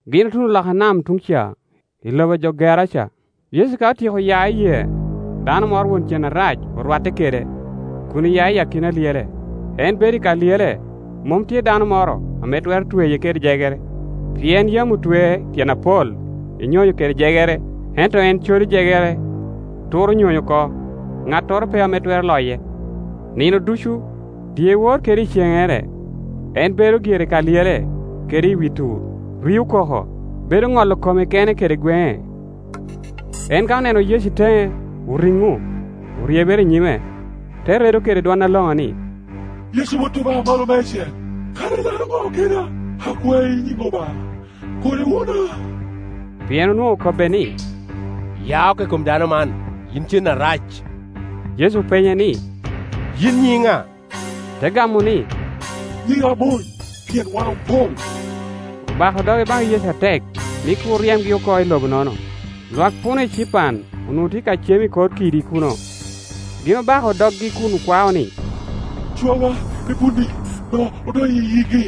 Gin otuno loka nam tuŋ ca i lobo a jo Geraca. Yecu ka otyeko ya i yee, dano moro won cen areco orwatte kede, kun oya i akina lyele. En bedo i ka Iyele, mom tye dano moro ame twero tweye kadi kede jegere; pien yam otwee tyen apol i nyony kede jegere, ento en codo jegere, turo nyony oko, ŋattoro pe ame twero loye. Nino ducu, dyewor kede iceŋŋere, en bedo gire i ka lyele kede i wi tur, rio koko, bedo ŋolo kome kene kede gweŋe. En ka oneno Yecu i teŋe, oriŋo, oryebere i nyime, te redo kede dwon aloŋo ni, “Yecu Wot Obaŋa Amalo Meicel, kara ilaro ŋo keda. Akwai i nyiŋ Obaŋa, kur iwuna.” Pien onwoŋo okobbe ni, “Ya oko i kom dano man, yin cen arac.” Yecu openye ni, “Yin nyiŋi ŋa?” Te gamo ni, “Nyiŋa Mony Mony: Leb Grik: Legion, pien wan opoŋ.” Obako doge baŋ Yecu atek ni kur ryemgi oko i lobo-nono. Lwak puno ecipan onwoŋo tye ka cem i kor kidi kuno. Gin obako doggi kun okwao ni, “Cwawa i punni, me odony i yigi.”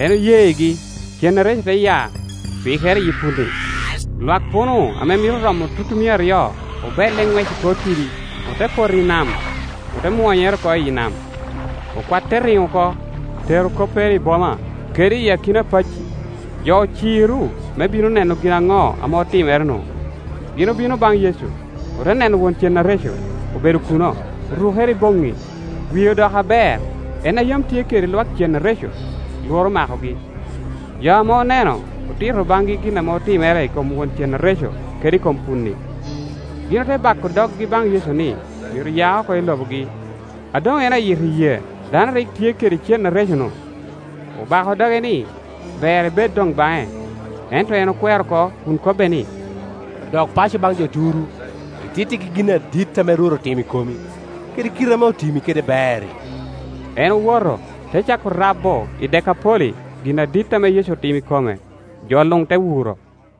En oyegi. Cen areco te ya, pikere iyi punni; lwak puno ame mito romo tutumia aryo obelle i ŋwec i kor kidi, ote poto i nam, ote mwonyere oko iyi nam. Okwat te riŋo oko, tero koppere i boma kede i akina pacci, jo ociro me bino neno gin aŋo ame otimere-nu. Gin obino baŋ Yecu, ote neno won cen areco obedo kuno, orukere i boŋŋi, wie odoko aber, en a yam tye kede lwak cen areco; lworo omakogi. Jo ame oneno otito baŋgi gin ame otimere i kom won cen areco kede i kom punni. Gin ote bako doggi baŋ Yecu ni myero ya oko i Iobogi. A doŋ en ayito i yee, dano a rik tye kede cen areco-nu obako doge ni ber ebed doŋ baŋe. Ento en okwero oko kun kobbe ni, “Dok paco baŋ jo turu, itittigi gin adit ame Rwot otimo i komi, kede kite ame otimi kede ber-ri.” En owoto, te cako rabo i Dekapoli gin adit ame Yecu otimo i kome; jo luŋ te wuro.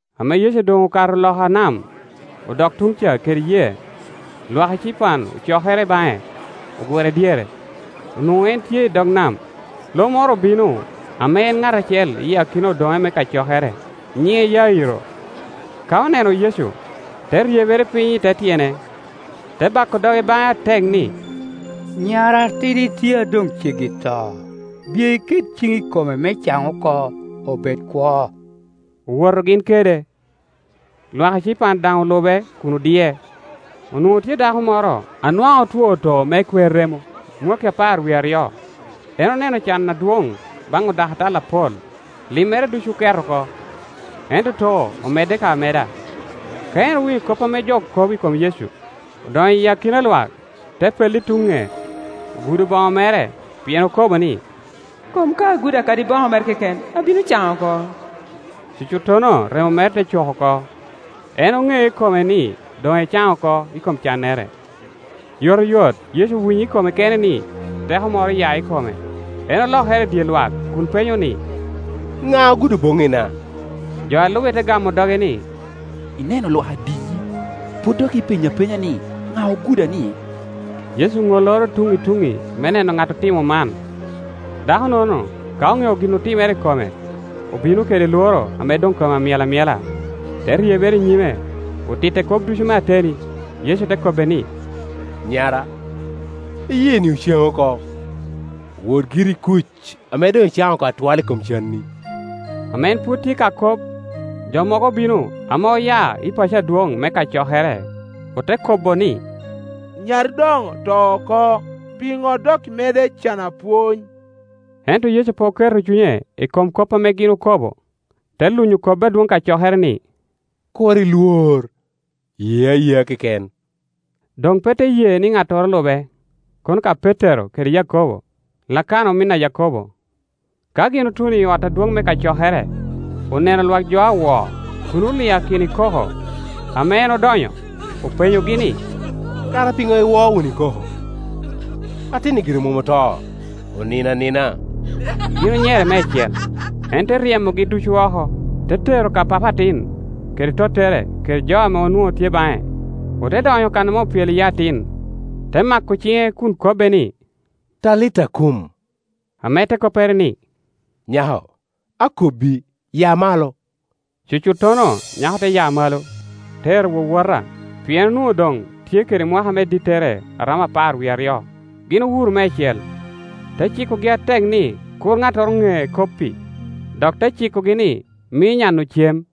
Ame Yecu doŋ okato loka nam, odok tuŋ ca kede yee, lwak ecipan ocokere baŋe, ogure dyere; onwoŋo en tye i dog nam. Lo moro obino ame en ŋat acel i akina odoŋe me kacokere, nyiŋe Yairo. Ka oneno Yecu, te ryebere piny i te tyene, te bako doge baŋe atek ni, “Nyara atidi tye a doŋ ceggi to. Biye iket ciŋi i kome me caŋ oko, obed kwo.” Owoto gin kede, lwak ecipan daŋ olube kun odie. Onwoŋo tye dako moro a nwaŋ otwo too me kwer remo mwakki apar wie aryo. En oneno can adwoŋ baŋ odakatal apol; limmere ducu oket oko, ento too omedde ka ameda. Ka en owinyo kop ame jo kobo i kom Yecu, odonyo i akina lwak, te pello i tuŋ ŋec, ogudo boŋo mere. Pien okobo ni, “Kom ka agudo kadi boŋo mere keken, abino caŋ oko.” Cucuttono remo mere te cok oko, en oŋeo i kome ni doŋ ecaŋ oko i kom cannere. Yotoyot Yecu owinyo i kome kene ni teko moro oya i kome; en olokere i dye lwak kun penyo ni, “Ŋa ogudo boŋŋina?” Jo a lube te gamo doge ni, “Ineno lwak adiyi, pwod dok ipenyo apenya ni, ‘Ŋa oguda-nie?’” Yecu oŋoloro tuŋŋi i tuŋŋi me neno ŋat otimo man. Dako-nono, ka oŋeo gin otimere i kome, obino kede lworo ame doŋ kome amyel amyela, te ryebere i nyime, otitte kop ducu me ateni. Yecu te kobbe ni, “Nyara, iyeeni ocaŋi oko, wot giri i kuc, ame doŋ icaŋ oko atwal i kom canni.” Ame en pwod tye ka kop, jo mogo obino ame oya i paco adwoŋ me kacokere, ote kobo ni, “Nyari doŋ oto oko; piŋo dok imedde cano apwony?” Ento Yecu pe oketo cunye i kom kop ame gin okobo, te lunyo kobbi adwoŋ kacokere ni, “Kur ilwor; ye ayea keken.” Doŋ pe te ye ni ŋattoro lube, kono ka Petero kede Yakobo, kede Lakana omin Yakobo. Ka gin otuno i ot adwoŋ me kacokere, oneno lwak jo a wo kun oliakino i koko. Ame en odonyo, openyogi ni, “Kara piŋo iwo wunu i koko? Atin-ni gire mom oto, onino anina.” Gin onyere meicel, en te ryemogi ducu oko, te tero ka papa atin kede tottere kede jo ame onwoŋo tye baŋe, ote donyo kan ame opyelo iye atin. Te mako ciŋe kun kobbe ni, “Talita kum,” ame te koppere ni, “Nyako, akobbi, ya malo.” Cucuttono nyako te ya malo, te ero wowota; pien onwoŋo doŋ tye kede mwaka me dittere a romo apar wie aryo. Gin owuro meicel. Te cikogi atek ni kur ŋattoro ŋe kop-pi, dok te cikogi ni mi nya-nu cem.